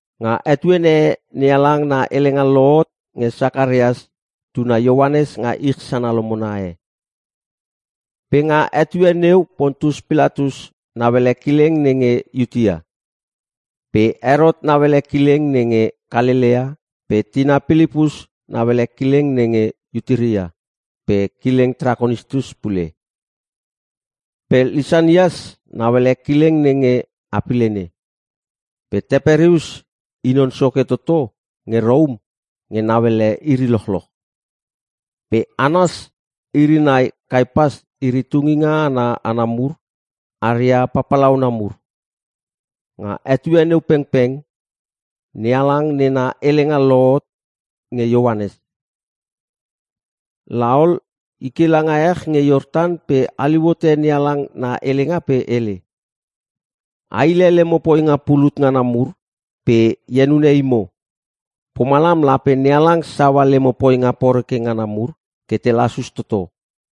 Nga etuene e NeHalang na helenga lohot nge Sakarias tuna Ioanes nga ich sana lomona e. Pe nga etue neu Pontius Pilatus nauele kileng nenge Iutea. Pe Herot nauele kileng nenge Kalelea pe tina Pilipus nauele kileng nenge Iturea pe kileng Trakonitis pule. Pe Lisanias nauele kileng nenge Apilene. Pe Teperius i non soke toto nge Rom nge nauele iri lochloch. Pe Anas iri nai Kaiapas iri tungina ana hana mur aria papalauna mur. Nga etue neu pengpeng NeHalang nena helenga lohot nge Ioanes. La ol, i ke langa ech nge Iortan pe haliu hote NeHalang na helenga pe hele, “A hile lemo poinga pulut ngana mur pe e henune imo. Pomalam lape NeHalang saua lemo poinga poreke ngana mur ke te lasus toto.”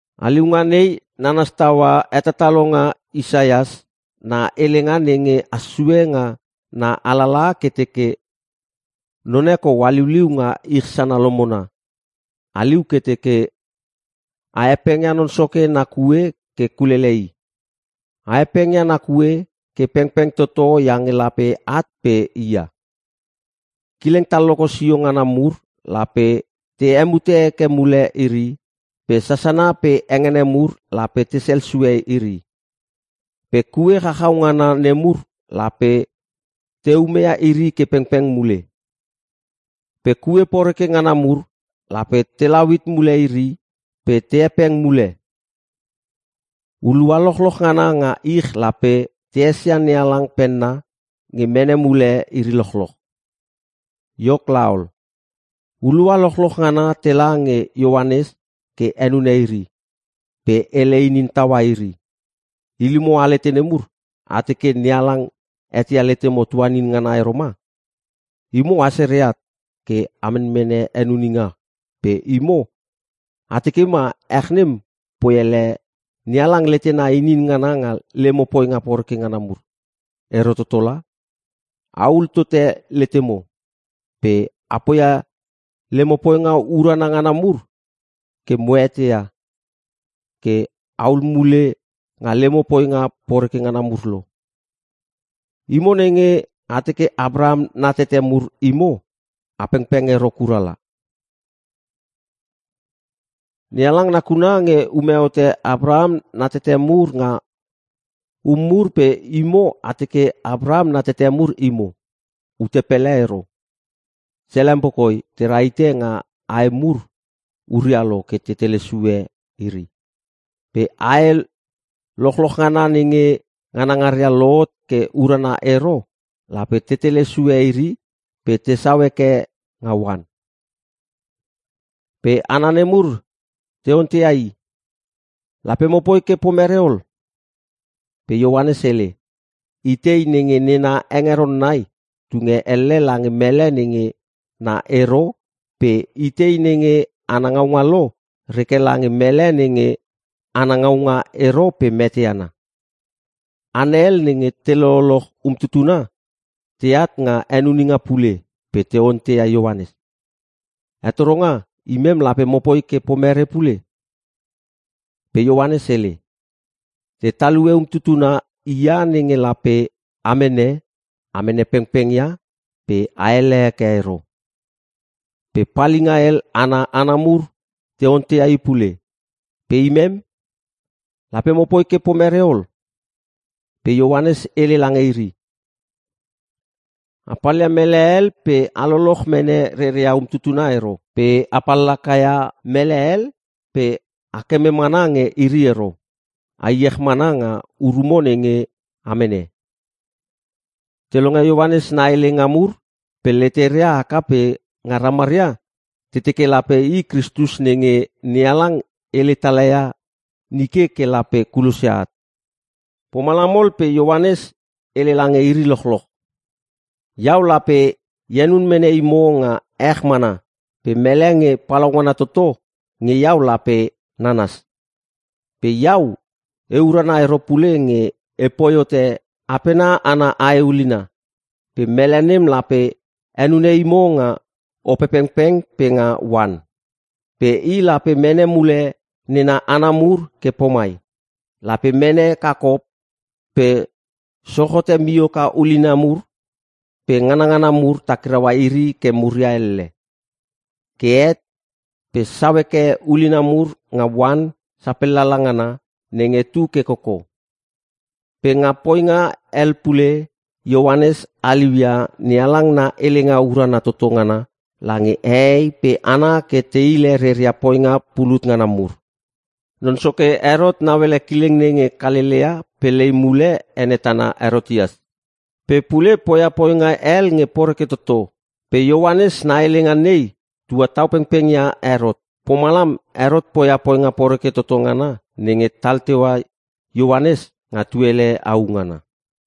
Haliunga nei nanas taua hetatalonga Isaias na helenga nenge has sue nga na alalaha ke teke, “None kou haliuliu nga ich sana lomona. Haliu ke teke, ‘A hepengia Non Soke na kue ke kulele i. A hepengia na kue ke pengpeng toto iange lape at pe i ia. Kileng talloko sio ngana mur lape te hemuta heke mule iri pe sasana pe hengene mur lape tesel sue iri. Pe kue chachau ngana nemur lape te umeia iri ke pengpeng mule. Pe kue poreke ngana mur lape telau hit mule iri pe te hepeng mule. Hulua lochloch ngana nga ich lape te esia NeHalang penna nge mene mule iri lochloch.’” Iok laol, hulua lochloch ngana tela nge Ioanes ke henune iri. Pe hele inin taua iri, “Ilimo alete nemur! A teke NeHalang eteia letemo tuanin ngana ero ma? Imo a sere at ke a menmene henuninga pe imo a teke ma ech nem poi ele NeHalang letena inin ngana nga lemo poinga poreke ngana mur. Ero toto la! A hul tote letemo! Pe a poia lemo poinga urana ngana mur ke mo eteia ke ahul mule nga lemo poinga poreke ngana mur lo. Imo nenge a teke Apraham na tete mur imo a pengpeng ero kura la. NeHalang nakuna nge ume hote Apraham nena tete mur nga um mur pe imo a teke Apraham na tete mur imo. Ute pele ero! Selempo koi te rahite nga ae mur huria lo ke te tele sue iri. Pe ae lochloch ngana nenge nganangaria lohot ke urana ero lape te tele sue iri pe tesau heke nga oan.” Pe hana nemur te onteia i, “Lape mopoi ke pomere ol?” Pe Ioanes hele, “Itei nenge nena hengeron nai tunge elle lange mele nenge na ero pe itei nenge ana ngaunga lo reke lange mele nenge ana ngaunga ero pe mete ana.” Hana hel nenge te lololoch umtutuna teat nga henuninga pule pe te onteia Ioanes, “Hetoronga imem lape mopoi ke pomere pule?” Pe Ioanes hele, “Te talue umtutuna hia nenge lape a mene, a mene pengpengia pe aele heke ero.” Pe palinga hel ana hana mur te onteia i pule, “Pe imem? Lape mopoi ke pomere ol?” Pe Ioanes hele lange iri, “A palia mele hel pe a loloch mene reria umtutuna ero. Pe a pallaka ia mele hel pe a keme mana nge iri ero. A iech mana nga urumo nenge a mene.” Te longe Ioanes na helenga mur pe leteria haka pe nga ramaria te teke lape i Kristus nenge NeHalang hele tala ia nike ke lape kulosia at. Pomalam ol pe Ioanes hele lange iri lochloch, “Iau lape e henun mene imo nga ech mana pe mele nge palaungana toto nge iau lape nananas. Pe iau e urana ero pule nge e poi hote apena ana ae ulina. Pe mele nem lape henune imo nga Opepengpeng pe nga oan. Pe i lape mene mule nena hana mur ke pomai; lape mene kakop pe sochote mioka ulina mur pe nganngana mur takiraua iri ke muria elle. Ke het pe sau heke ulina mur nga oan sapel lala ngana nenge tu ke koko.” Pe nga poinga hel pule Ioanes haliu ia NeHalang na helenga urana toto ngana lange hehei pe hana ke te hile reria poinga pulut ngana mur. Non soke Herot nauele kileng nenge Kalelea pe lei mule ene tana Herotias. Pe pule poia poinga hel nge poreke toto. Pe Ioanes na helenga nei tua tau pengpeng ia Herot. Pomalam Herot poia poinga poreke toto ngana nenge tal teua Ioanes nga tuele au ngana.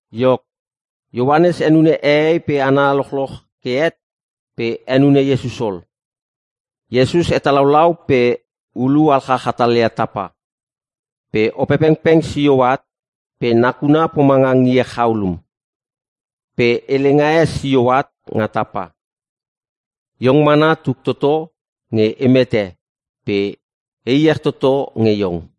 Iok, Ioanes henune hehei pe hana lochloch ke het pe henune Iesus ol. Iesus hetalaulau pe ulu alchach hatalia tapa. Pe Opepengpeng sio at pe nakuna pomanga ngie chaulum. Pe helenga e sio at nga tapa, “Iong mana tuk toto nge e mete pe e iech toto nge iong.”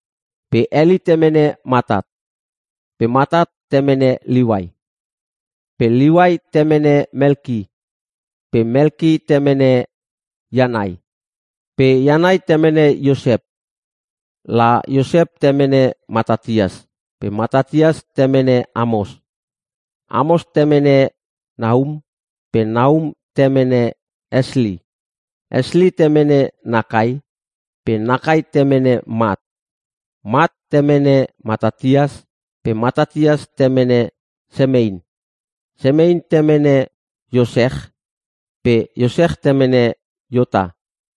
Pe Heli temene Matat. Pe Matat temene Liuai. Pe Liuai temene Melki. Pe Melki temene Ianai. Pe Ianai temene Iosep. La Iosep temene Matatias pe Matatias temene Amos. Amos temene Nahum pe Nahum temene Esli. Esli temene Nakai pe Nakai temene Mat. Mat temene Matatias pe Matatias temene Semein. Semein temene Iosech pe Iosech temene Iota.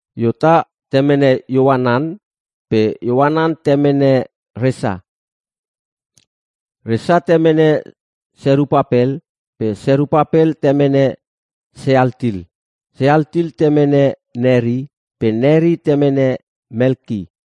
Iota temene Ioanan pe Ioanan temene Resa. Resa temene Serupapel pe Serupapel temene Sealtil. Sealtil temene Neri pe Neri temene Melki.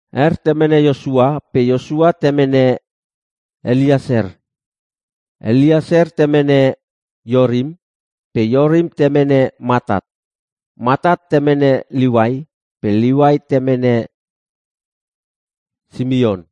Er temene Iosua pe Iosua temene Elieser. Elieser temene Iorim pe Iorim temene Mattat. Mattat temene Liuai pe Liuai temene Simeon.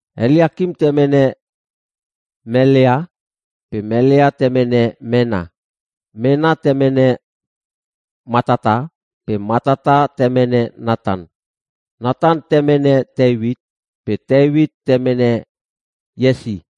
Eliakim temene Melea pe Melea temene Menna. Menna temene Mattata pe Mattata temene Natan. Natan temene Teuit pe Teuit temene Iesi.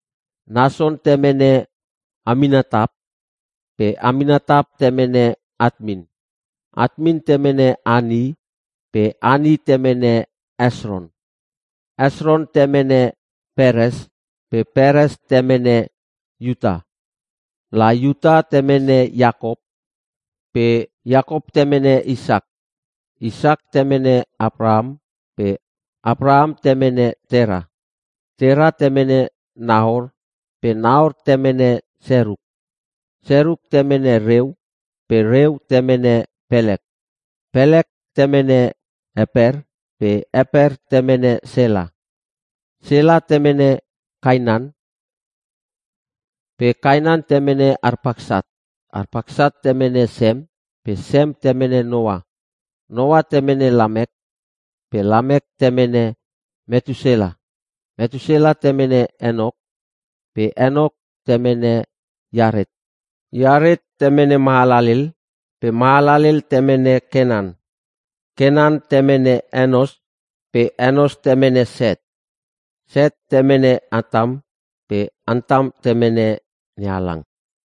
Nason temene Aminatap pe Aminatap temene Atmin. Atmin temene Ani pe Ani temene Hesron. Hesron temene Peres pe Peres temene Iuta. La Iuta temene Iakop pe Iakop temene Isak. Isak temene Apraham pe Apraham temene Tera. Tera temene Nahor pe Nahor temene Seruk. Seruk temene Reu pe Reu temene Pelek. Pelek temene Eper pe Eper temene Sela. Sela temene Kainan pe Kainan temene Arpaksat. Arpaksat temene Sem pe Sem temene Noa. Noa temene Lamek pe Lamek temene Metusela. Metusela temene Enok pe Enok temene Iaret. Iaret temene Mahalalel pe Mahalalel temene Kenan. Kenan temene Enos pe Enos temene Set. Set temene Antam pe Antam temene NeHalang.